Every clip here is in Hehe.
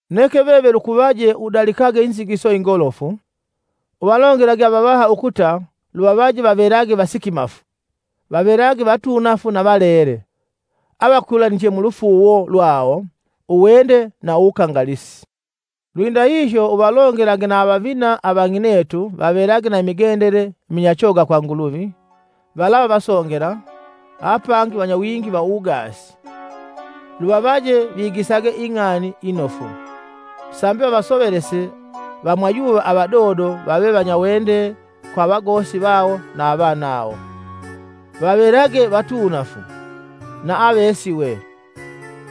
Neke veve lukuvaje udalikage inzigiso ingolofu. Uvalongelage avavaha ukuta luvavaje vavelage vasikimafu, vavelage vatuunafu na valele; avakwilaniche mulufuuwo lwawo, uwende na uwukangalisi. Lwindahihyo uvalongelage na avavina avang'inetu vavelage na imigendele minyachoga kwa Nguluvi, valava vasongela, apangi vanyawingi va uwugaasi. Luvavaje vigisage ing'ani inofu, Sambi vavasovelese vamwayuva avadodo vave vanyawende kwa avagosi vawo na avanawo, vavelage vatuunafu, na avesiwe,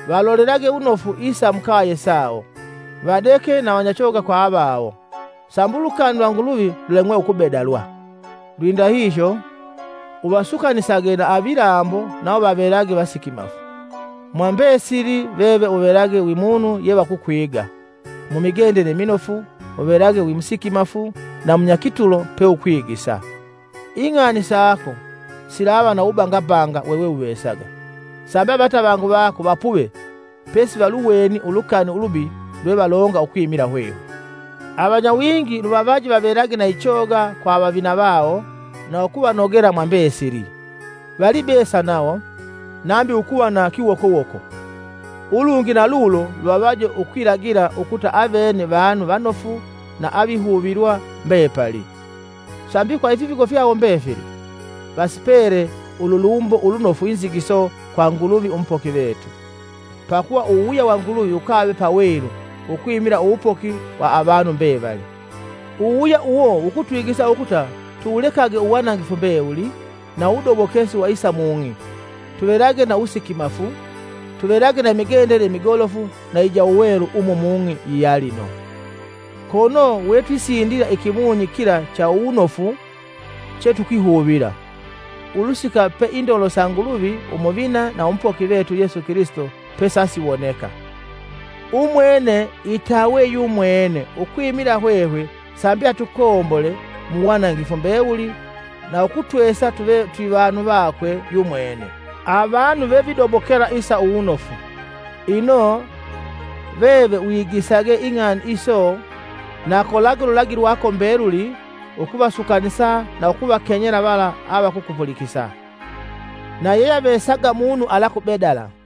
valolelage wunofu isa mukaye sawo, vadeke na vanyachoga kwa avavawo, sambi ulukani lwa Nguluvi lulemwe ukubedalwa. Lwindahihyo, uvasukanisage na avilambo nawo vavelage vasikimafu. Mwa mbesili veve uvelage wi munu yevakukwiga mumigendele iminofu, uvelage wi musikimafu na munyakitulo peukwigisa. Ing'ani sako silava na uwubangabanga wewuvesaga; sambi avatavangu vako vapuve pesi valuweni ulukani ulubi lwevalonga ukwimila hwehwe. Avanyawingi luvavaje vavelage na ichoga kwa avavina vawo na ukuvanogela mwa mbesili. Valibesa nawo, nambi ukuva na kiwokowoko. Ulungi na lulo luvavaje ukwilagila ukuta avene vanu vanofu na avihuvilwa mbepali, sambi kwa ifipigo fyawo mbefili. Vasipele ululumbo ulunofu inzigiso kwa Nguluvi, Umupoki vetu. Pakuva uwuwuya wa Nguluvi wukave pawelu ukwimila uwupoki wa avanu mbevali. Uwuwuya uwo wukutwigisa ukuta tuwulekage uwanangifu mbewuli na uwudobokesi wa isa mung'i, tuvelage na uwusikimafu, tuvelage na imigendele imigolofu na ija uwelu umu mung'i iyalino, kono wetwisindila ikimunyi kila cha uwunofu chetukwihuvila, ulusika pe indolo sa Nguluvi umuvina na umupoki vetu Yesu Kilisito pesasiwoneka. Umwene itawe yumwene ukwimila hwehwe sambi atukombole mu wanangifu mbewuli na ukutwesa tuve twivanu vakwe yumwene, avanu vevidobokela isa uwunofu. Ino, veve wigisage ing'ani iso na pigilage kolage ululagi lwako mbeluli ukuvasukanisa na ukuvakenyela vala avakukupulikisa. Na ulolelage munu alakubedala.